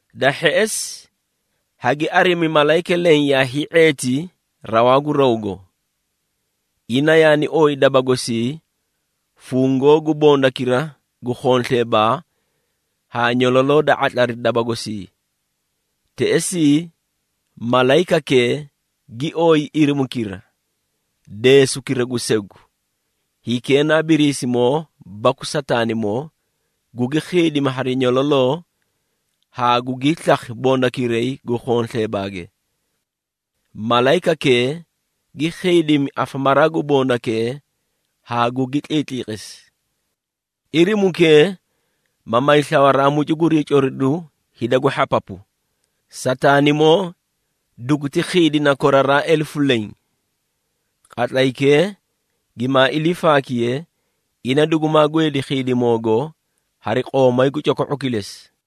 Da hheꞌesi, hagi arimi malayika leẽ yaa hii⁄eeti rawaa gu rawgo. Ina yaani ooyi daba gosii fungoo gu bondakira gu khonsleebaa haa nyololoo da ⁄atlari daba gosii. Teꞌesii, malayikakee gi ooyi irimukira, deesukira gu segu, hikee na Biriisimoo baku Sataanimoo, gugi khiidimi hari nyololoo haa gugii slakhi bondakiray gu khonsleebaage. Malayikakee gi khiidimi afamaraa gu bondakee haa gugi tliitliqisi. Irimukee ma may slawaaraa mucu gurii coriduu hida gu hhapapu. Sataanimoo duguti khiidina koraraa elefu leẽ. Qatlaykee gimaa ilii faakiye, ina dugumaa gweedi khiidimoogo hari qoomay gu coko⁄o kilesi.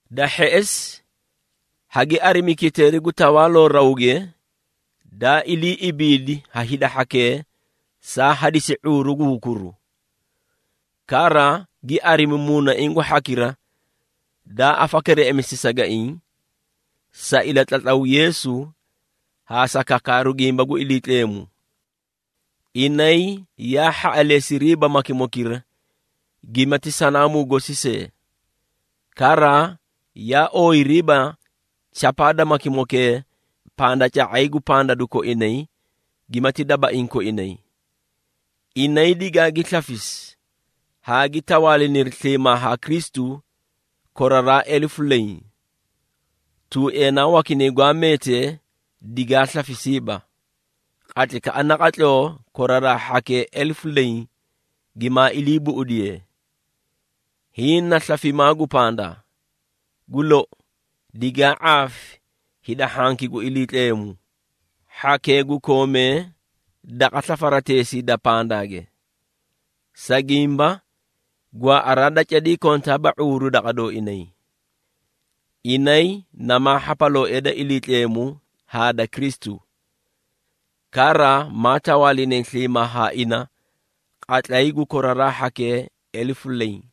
Da hheꞌesi, hagi arimi kiteeri gu tawaaloo rawge, daa ilii ibiidi ha hida hhakee saa hadisi ⁄uuru gu hukuru. Kara, gi arimi muunaiĩ gu hhakira daa afakereꞌemisi sagaiĩ, sa ilatlatlaw Yeesu haa sa kakaaru gimba gu Iliitleemu. Inay yaa hhaꞌaleesiriiba makimokira gimati sanaamuu gosi see, kara yaa ooyiriiba chapaa da makimokee pandaca⁄ay gu pandadu koinay gimati dabaiĩ koinay. Inay digaagi slafisi haa gi tawaaliniri sliimaa haa Kristu koraraa elefu leẽ. Tuueenaa wakinay gwaa meetee digaa slafisiiba, qatlaykaꞌa naqatloo koraraa hhakee elefu leẽ gimaa ilii buꞌudiye. Hiĩ na slafimaa gu pandaa. Gu lou, digaa ⁄aafi hida hhanki gu Iliitleemu, hhakee gu koomee daqa slafarateesii da pandaage. Sa gimba, gwaaꞌaraa da cadii kontaaba ⁄uuru daqa dooinay. Inay namaa hhapalooee da Iliitleemu haa da Kristu. Kara maa tawaalinay sliimaa haa ina qatlay gu koraraa hhakee elefu leẽ.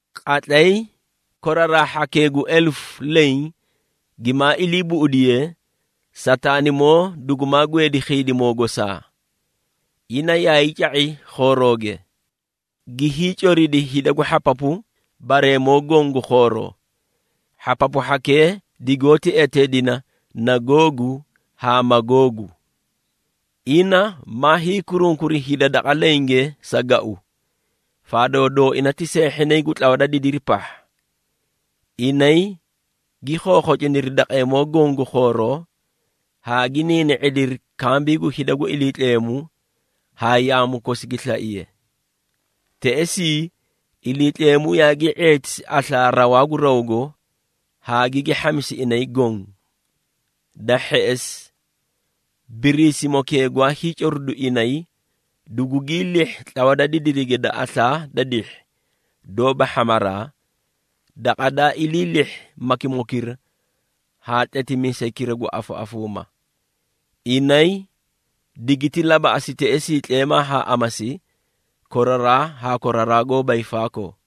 Qatlay koraraa hhakee gu elefu leẽ gimaa ilii buꞌudiyee, Sataanimoo dugumaa gweedi khiidimoo gosaa. Ina yaay ca⁄i khoorooge, gi hiicoridi hida gu hhapapu bareemoo goõ gu khooroo. Hhapapu hhakee digoóti eteedina na Googu haa Magoogu. Ina ma hiikurunkuri hida daqa lenge sa gau, faadoo dooina ti seehhinay gu tlawa da didiri pahha. Inay gi khokhociniri daqeemoo goõ gu khooroo haa gi niini⁄idiri kambii gu hida gu Iliitleemu haa yaamu kosi gi slaiye. Teꞌesii, Iliitleemu yaagii ⁄eetisi aslaa rawaa gu rawgo haa gigi hhamisi inay goõ. Da hheꞌesi, Biriisimokee gwaa hiicoridu inay, dugugii lihhi tlawa da didirige da aslaa da dihhi doóba hhamaraa, daqa daa ilii lihhi makimokira haa tletimiisaykira gu afaꞌafuuma. Inay digiti labaꞌasi teꞌesii tleemaa haa amasi koraraa haa koraraa goóba hiifaakoo.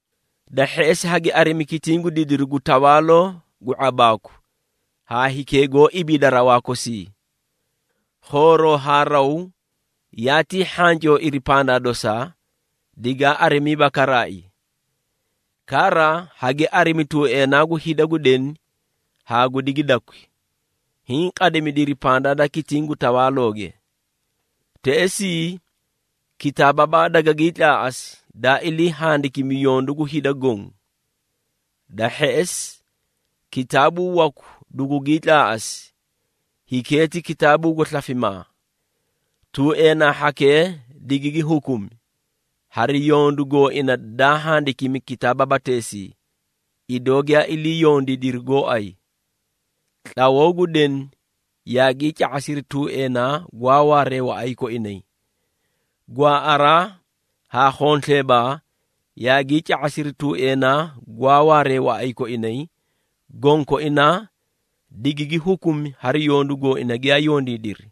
Da hheꞌesi, hagi arimi kitiĩ gu didiru gu tawaaloo gu ⁄abaaku haa hikee goó ibiida rawaa kosii. Khooroo haa raw yaatii hhancooiri pandaa dosaa, digaa arimiiba karaai. Kara, hagi arimi tuueenaa gu hida gu deni haa gu digidakwi hiĩ qadimidiri pandaa da kitiĩ gu tawaalooge. Teꞌesii kitaababaa dagagii tlaaꞌasi daa ilii handikimi yondu gu hida goõ. Da hheꞌesi, kitaabuu waku dugugii tlaaꞌasi, hikee ti kitaabuu gu slafimaa. Tuueenaa hhakee digigi hukumi, hari yondu gooina daa handikimi kitaababateesii, idoo giyaa ilii yondiidiri gooay. Tlawoo gu deni yaagii ca⁄asiri tuueenaa gwaa waaree waꞌay koinay. Gwaaꞌaraa haa khonsleebaa yaagii ca⁄asiri tuueenaa gwaa waaree waꞌay koinay, gonkoinaa digigi hukumi hari yondu gooina giyaa yondiidiri.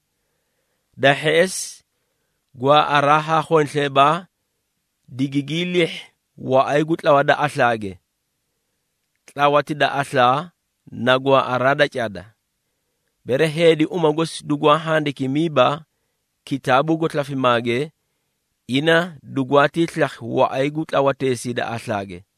Da hheꞌesi, gwaaꞌaraa haa khonsleebaa digigii lihhi waꞌay gu tlawa da aslaage. Tlawati da aslaa na gwaaꞌaraa da cada. Bere heedi uma gosi dugwaa handikimiiba kitaabuu gu slafimaage, ina dugwaatii slakhi waꞌay gu tlawateesii da aslaage.